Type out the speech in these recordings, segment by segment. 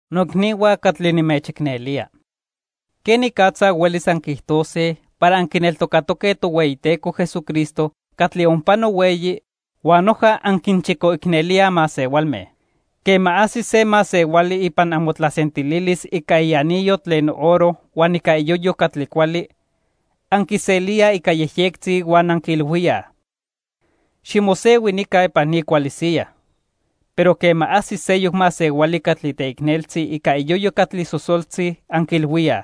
Noicnihua catli nimechicnelía. ¿Quenicatza huelis anquiijtose para anquineltocatoque Tohueyiteco Jesucristo catli onpano hueyi, huan noja anquinchicoicnelíaj masehualme? Quema ajsi se masehuali ipan amotlasentililis ica ianillo tlen oro huan ica iyoyo catli cuali, anquiselíaj ica yejyectzi huan anquiilhuíaj: "Ximosehui nica ipan ni cuali siyaj." Pero quema ajsis seyoc masehuali catli teicneltzi ica iyoyo catli sosoltzi, anquiilhuíaj: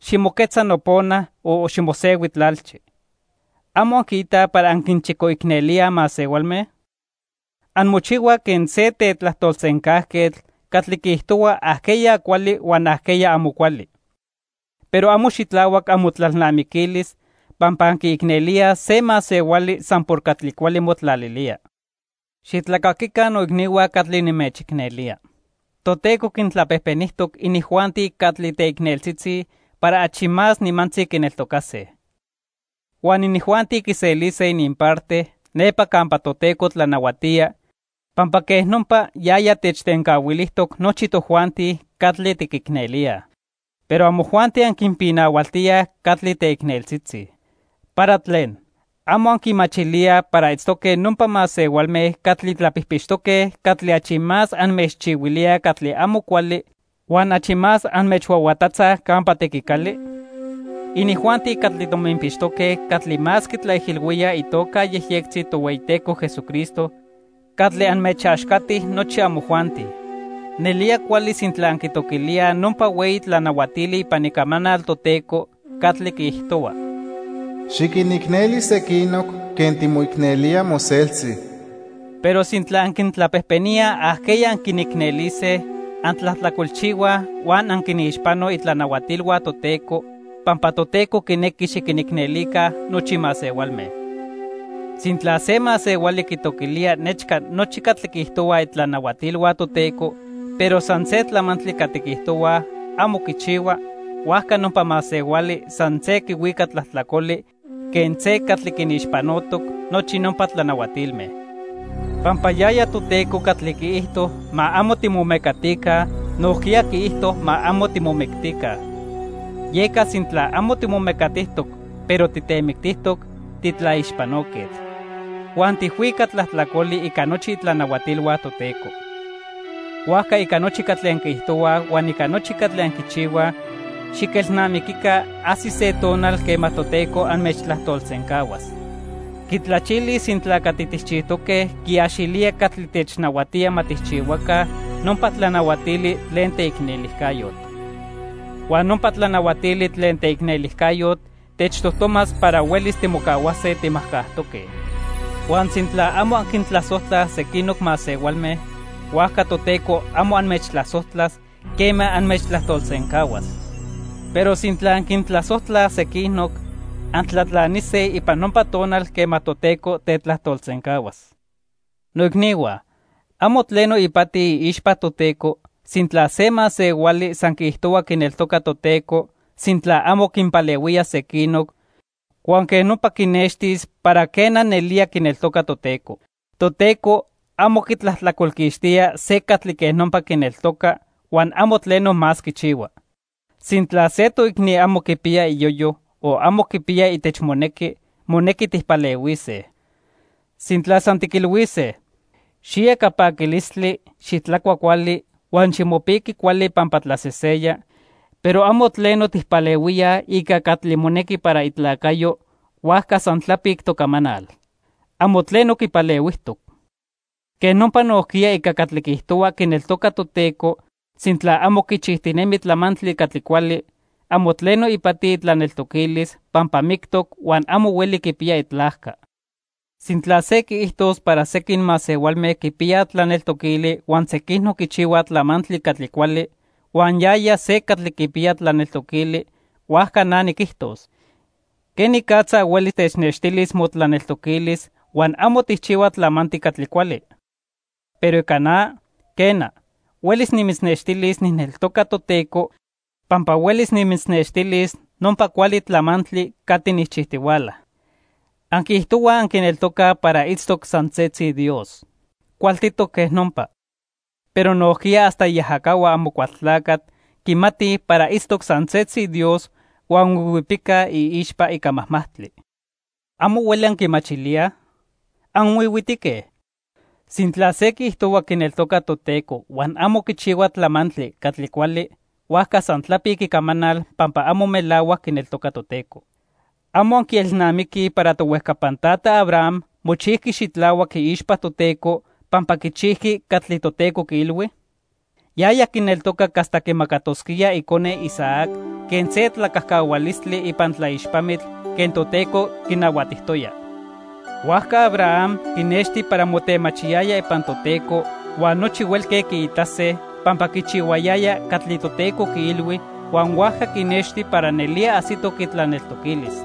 "Ximoquetza nopona o ximosehui tlalchi." ¿Amo anquiitaj para anquinchicoicnelíaj masehualme? Anmochihuaj quen se tetlajtolsencajquetl catli quiijtohua ajqueya cuali huan ajqueya amo cuali. Pero amo xitlahuac amotlalnamiquilis pampa anquiicnelíaj se masehuali san por catli cuali motlalilía. Xitlacaquica noicnihua catli nimechicnelía. Toteco quintlapejpenijtoc inijuanti catli teicneltzitzi para achi más nimantzi quineltocase. Huan inijuanti quiselise ininparte nepa campa Toteco tlanahuatía, pampa quej nopa yaya techtencahuilijtoc nochi tojuanti catli tiquicnelíaj. Pero amojuanti anquinpinahualtíaj catli teicneltzitzi. ¿Para tlen? ¿Amo anquimachilíaj para itztoque nopa masehualme catli tlapijpixtoque catli achi más anmechchihuilíaj catli amo cuali huan achi más anmechhuahuatatzaj campa tequicali? Inijuanti catli tominpixtoque catli más quitlaijilhuíaj itoca yejyectzi Tohueyiteco Jesucristo catli anmechaxcati nochi amojuanti. Nelía cuali sintla anquitoquilíaj nopa hueyi tlanahuatili ipan Icamanal Toteco catli quiijtohua: "Xiquinicneli sequinoc quen timoicnelía moseltzi." Pero sintla anquintlapejpeníaj ajqueya anquinicnelise, antlajtlacolchihuaj huan anquinixpanoj itlanahuatilhua Toteco, pampa Toteco quinequi xiquinicnelica nochi masehualme. Sintla se masehuali quitoquilía nechca nochi catli quiijtohuaj itlanahuatilhua Toteco, pero san se tlamantli catli quiijtohuaj amo quichihua, huajca nopa masehuali san se quihuica tlajtlacoli quen se catli quinixpanotoc nochi nopa tlanahuatilme. Pampa yaya Toteco catli quiijto ma amo timomecatica, nojquiya quiijto ma amo timomictica. Yeca sintla amo timomecatijtoc, pero titemictijtoc, titlaixpanoquetl. Huan tijhuica tlajtlacoli ica nochi itlanahuatilhua Toteco. Huajca ica nochi catli anquiijtohuaj huan ica nochi catli anquichihuaj, xiquelnamiquica ajsis se tonal quema Toteco anmechtlajtolsencahuas. Quitlachilis sintla catli tijchijtoque quiaxilía catli technahuatía ma tijchihuaca nopa tlanahuatili tlen teicnelijcayotl. Huan nopa tlanahuatili tlen teicnelijcayotl techtojtomas para huelis timocahuase timajcajtoque. Huan sintla amo anquintlasojtlaj sequinoc masehualme, huajca Toteco amo anmechtlasojtlas quema anmechtlajtolsencahuas. Pero sintla anquintlasojtlaj sequinoc, antlatlanise ipan nopa tonal quema Toteco tetlajtolsencahuas. Noicnihua, amo tleno ipati iixpa Toteco sintla se masehuali san quiijtohua quineltoca Toteco, sintla amo quinpalehuía sequinoc huan quej nopa quinextis para, quena, nelía quineltoca Toteco. Toteco amo quitlajtlacolquixtía se catli quej nopa quineltoca, huan amo tleno más quichihua. Sintla se toicni amo quipiya iyoyo o amo quipiya itechmonequi, monequi tijpalehuise. Sintla san tiquilhuise: "Xiya ica paquilistli, xitlacua cuali, huan ximopiqui cuali pampa tlaseseya", pero amo tleno tijpalehuíaj ica catli monequi para itlacayo, huajca san tlapic tocamanal. Amo tleno quipalehuijtoc. Quej nopa nojquiya ica catli quiijtohua quineltoca Toteco, sintla amo quichijtinemi tlamantli catli cuali, amo tleno ipati itlaneltoquilis pampa mictoc huan amo hueli quipiya itlajca. Sintla se quiijtos para sequin masehualme quipiyaj tlaneltoquili huan sequinoc quichihuaj tlamantli catli cuali, huan yaya se catli quipiya tlaneltoquili, huajca na niquijtos: ¿quenicatza hueli technextilis motlaneltoquilis huan amo tijchihua tlamantli catli cuali? Pero ica na, quena, huelis nimitznextilis nijneltoca Toteco, pampa huelis nimitznextilis nopa cuali tlamantli catli nijchijtihuala. Anquiijtohuaj anquineltocaj para itztoc san setzi Dios. Cualtitoc quej nopa. Pero nojquiya hasta iajacahua Amocualtlacatl quimatij para itztoc san setzi Dios huan huihuipicaj iixpa ica majmajtli. ¿Amo hueli anquimachilíaj? ¿Anhuihuitique? Sintla se quiijtohua quineltoca Toteco huan amo quichihua tlamantli catli cuali, huajca san tlapic icamanal pampa amo melahuac quineltoca Toteco. ¿Amo anquielnamiquij para tohuejcapan tata Abraham mochijqui xitlahuac iixpa Toteco pampa quichijqui catli Toteco quiilhui? Yaya quineltocac hasta quimacatosquía icone, Isaac, quen se tlacajcahualistli ipan tlaixpamitl quen Toteco quinahuatijtoya. Huajca Abraham quinexti para motemachiyaya ipan Toteco huan nochi huelque quiitase, pampa quichihuayaya catli Toteco quiilhui huan huajca quinexti para nelía ajsitoc itlaneltoquilis.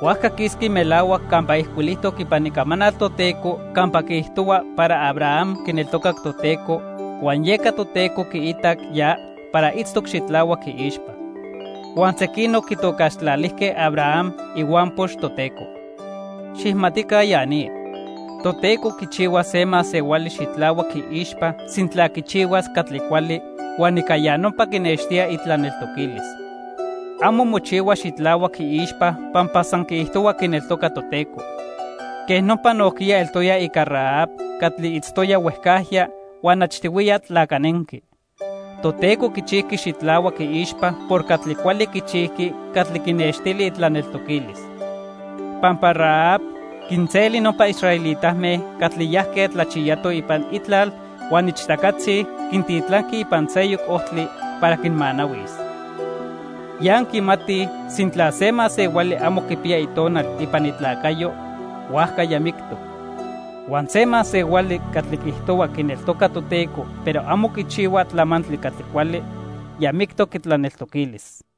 Huajca quisqui melahuac campa ijcuilijtoc ipan Icamanal Toteco campa quiijtohua para Abraham quineltocac Toteco, huan yeca Toteco quiitac ya para itztoc xitlahuac iixpa. Huan sequinoc quitocaxtlalijque Abraham "ihuampox Toteco". Xijmatica ya ni, Toteco quichihua se masehuali xitlahuac iixpa sintla quichihuas catli cuali, huan ica ya nopa quinextía itlaneltoquilis. Amo mochihua xitlahuac iixpa pampa san quiijtohua quineltoca Toteco. Quej nopa nojquiya eltoya ica Rahab catli itztoya huejcajya huan achtihuiya tlacanenqui. Toteco quichijqui xitlahuac iixpa por catli cuali quichijqui catli quinextili itlaneltoquilis. Pampa Rahab quinseli nopa israelitame catli yajque tlachiyatoj ipan itlal huan ichtacatzi quintitlanqui ipan seyoc ojtli para quinmanahuis. Ya anquimatij sintla se masehuali amo quipiya itonal ipan itlacayo, huajca ya mictoc. Huan se masehuali catli quiijtohua quineltoca Toteco, pero amo quichihua tlamantli catli cuali, ya mictoc itlaneltoquilis.